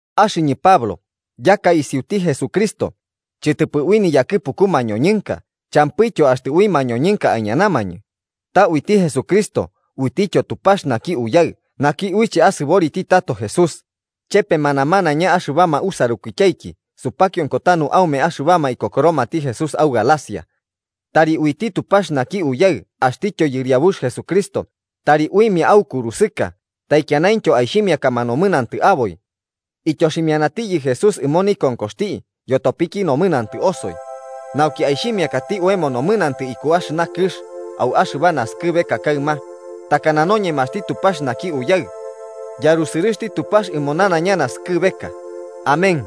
Axɨñɨ Pablo yaka isiuti Jesucristo, chɨtɨpɨ ui niyakɨpuku mañoñɨnka champɨityo axtɨ ui mañoñɨnka aiñanamañɨ, ta uiti Jesucristo uitityo Tupax naki Uyaɨ naki uiche asɨboriti tato Jesús, chepema namanaiña axɨbama usarukityaiki supakionko tanu aume axɨbama ikokoromati Jesús au Galacia. Tari uiti Tupax naki Uyaɨ axtityo Yɨriabux Jesucristo tari uimia aukurusɨka taikianaintyo aixhimiakama nomɨnantɨ aboi. Ityoximianatiyɨ Jesús ɨmo nikonkoxti yotopiki nomɨnantɨ osoi, nauki aixhimiakati oemo nomɨnantɨ iku axɨna kɨx au axɨba naskɨbeka kaɨma, takana noñemaxti Tupax naki Uyaɨ. ¡Yarusɨrɨxti Tupax ɨmo nanaiña naskɨbeka! Amén.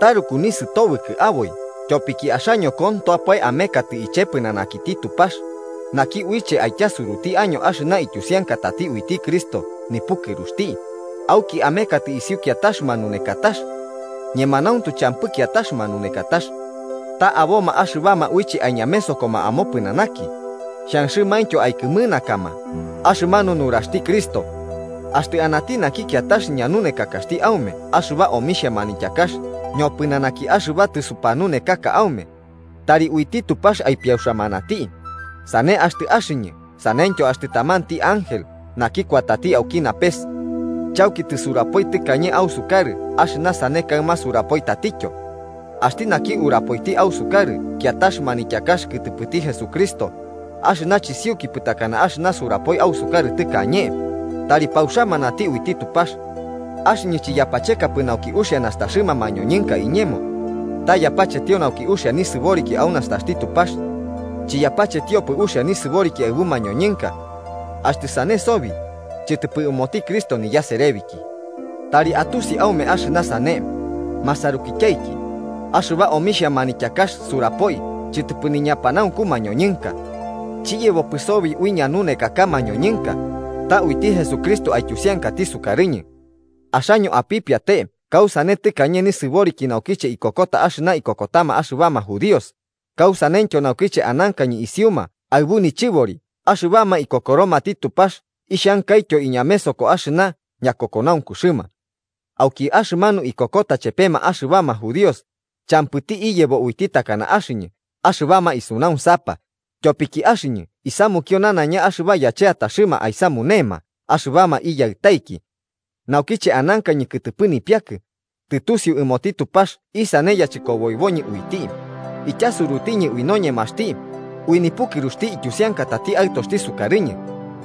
Taruku nisɨtobɨkɨ aboi tyopiki axaño kontoapae amekatɨ iche pɨnanakiti Tupax, naki uiche aityasuruti año axɨna ityusiankatati uiti Cristo nipukɨruxti, auki amekatɨ isiu kiatax manunekatax. Ñemanauntu champɨ kiatax manunekatax. Ta aboma axɨbama uiche aiñamesokoma amopɨnanaki, xhanxɨmaintyo aikɨmɨnakama axɨmanu nuraxti Cristo. Axtɨ anati naki kiatax ñanunekakaxti aume axɨba omixhia manityakax ñopɨnanaki axɨba tɨsupanunekaka aume, tari uiti Tupax aipiauxamanati, sane axtɨ axɨñɨ saneityo axtɨ tamanti ángel naki kuatati auki napes. Chauki tɨsuburapoi tɨkañe ausukarɨ axɨna sane kaɨma surapoi tatityo: Axti naki urapoiti ausukarɨ kiatax manityakax kɨtɨpɨti Jesucristo, axɨna chisiukipɨ takana axɨna surapoi ausukarɨ tɨkañe, tari pauxamanati uiti Tupax. Axɨñɨ chiyapachekapɨ nauki uxia nastaxɨma mañoñɨnka iñemo, ta yapachetio nauki uxia nisɨboriki au nastaxti Tupax. Chiyapachetiopɨ uxia nisɨboriki aɨbu mañoñɨnka. ¡Axtɨ sane sobi, chɨtɨpɨ ɨmoti Cristo niyaserebiki! Tari atusi aume axɨna sane, masarukityaiki: axɨba omixhia manityakax surapoi chɨtɨpɨ niñapanaunku mañoñɨnka. Chiyebopɨ sobi ui ñanunekaka mañoñɨnka, ta uiti Jesucristo aityusiankati sukarɨñɨ. Axaño apipiate kausane tɨkañe nisɨboriki naukiche ikokota axɨna ikokotama axɨbama judíos, kausaneityo naukiche anankañɨ isiuma aɨbu nichɨbori axɨbama ikokoromati Tupax ixhankaityo iñamesoko axɨna ñakokonaunkuxɨma. Auki axɨmanu ikokota chepema axɨbama judíos, champɨti iyebo uiti takana axɨñɨ axɨbama isunaunsapa, tyopiki axɨñɨ isamukio nanaiña axɨba yacheataxɨma aisamunema axɨbama iyaɨtaiki. Naukiche anankañɨnki kɨtɨpɨ nipiakɨ, tɨtusiu ɨmoti Tupax isane yachɨkoboiboñɨ uiti, ityasurutiñɨ ui noñemaxti, ui nipukɨruxti ityusiankatati Aɨtoxti sukarɨñɨ,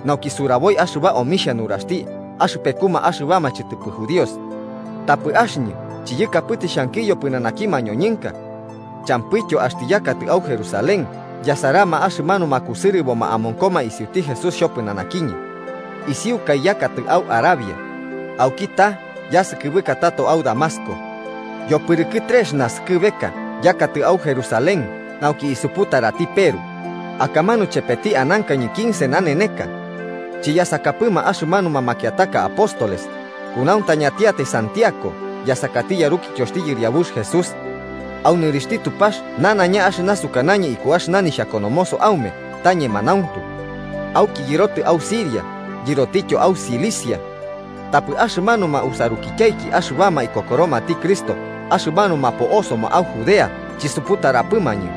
nauki suraboi axɨba omixhia nuraxti axɨpekuma axɨbama chɨtɨpɨ judíos. Tapɨ axɨñɨ chiyakapɨtɨ xhankiyo pɨnanaki mañoñɨnka. Champɨityo axtɨ yakatɨ au Jerusalén yasarama axɨmanuma kusɨrɨboma amonkoma isiuti Jesús xhopɨnanakiñɨ. Isiukai yakatɨ au Arabia, auki ta'a yasɨkɨbɨka tato au Damasco. Yopɨrɨkɨ trex naskɨbeka yakatɨ au Jerusalén nauki isuputarati Peru, akamanu chepeti anankañɨ quince naneneka. Chiyasakapɨma axɨmanuma makiataka apóstoles, kunauntañantiatai Santiago yasakati yarukityoxti Yɨriabux Jesús. Au nɨrixhti Tupax nanaiña axɨna sukanañɨ iku axɨna nixhakonomoso aume ta ñemanauntu. Auki yɨrotɨ au Siria yɨrotityo au Cilicia. Tapɨ axɨmanuma usarukityaiki axɨbama ikokoromati Cristo axɨmanuma po'osoma au Judea chisuputarapɨmañɨ.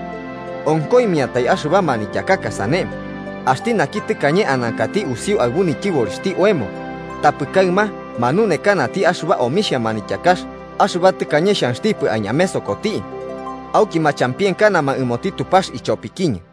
Onkoimiantai axɨba manityakaka sane: “Axti naki tɨkañe anankati usiu aɨbu nityɨborixhti oemo, tapɨ kaɨma manunekanati axɨba omixhia manityakax axɨba tɨkañe xhanxtipɨ aiñamesokoti.” Auki machampienkanama ɨmoti Tupax ichopikiñɨ.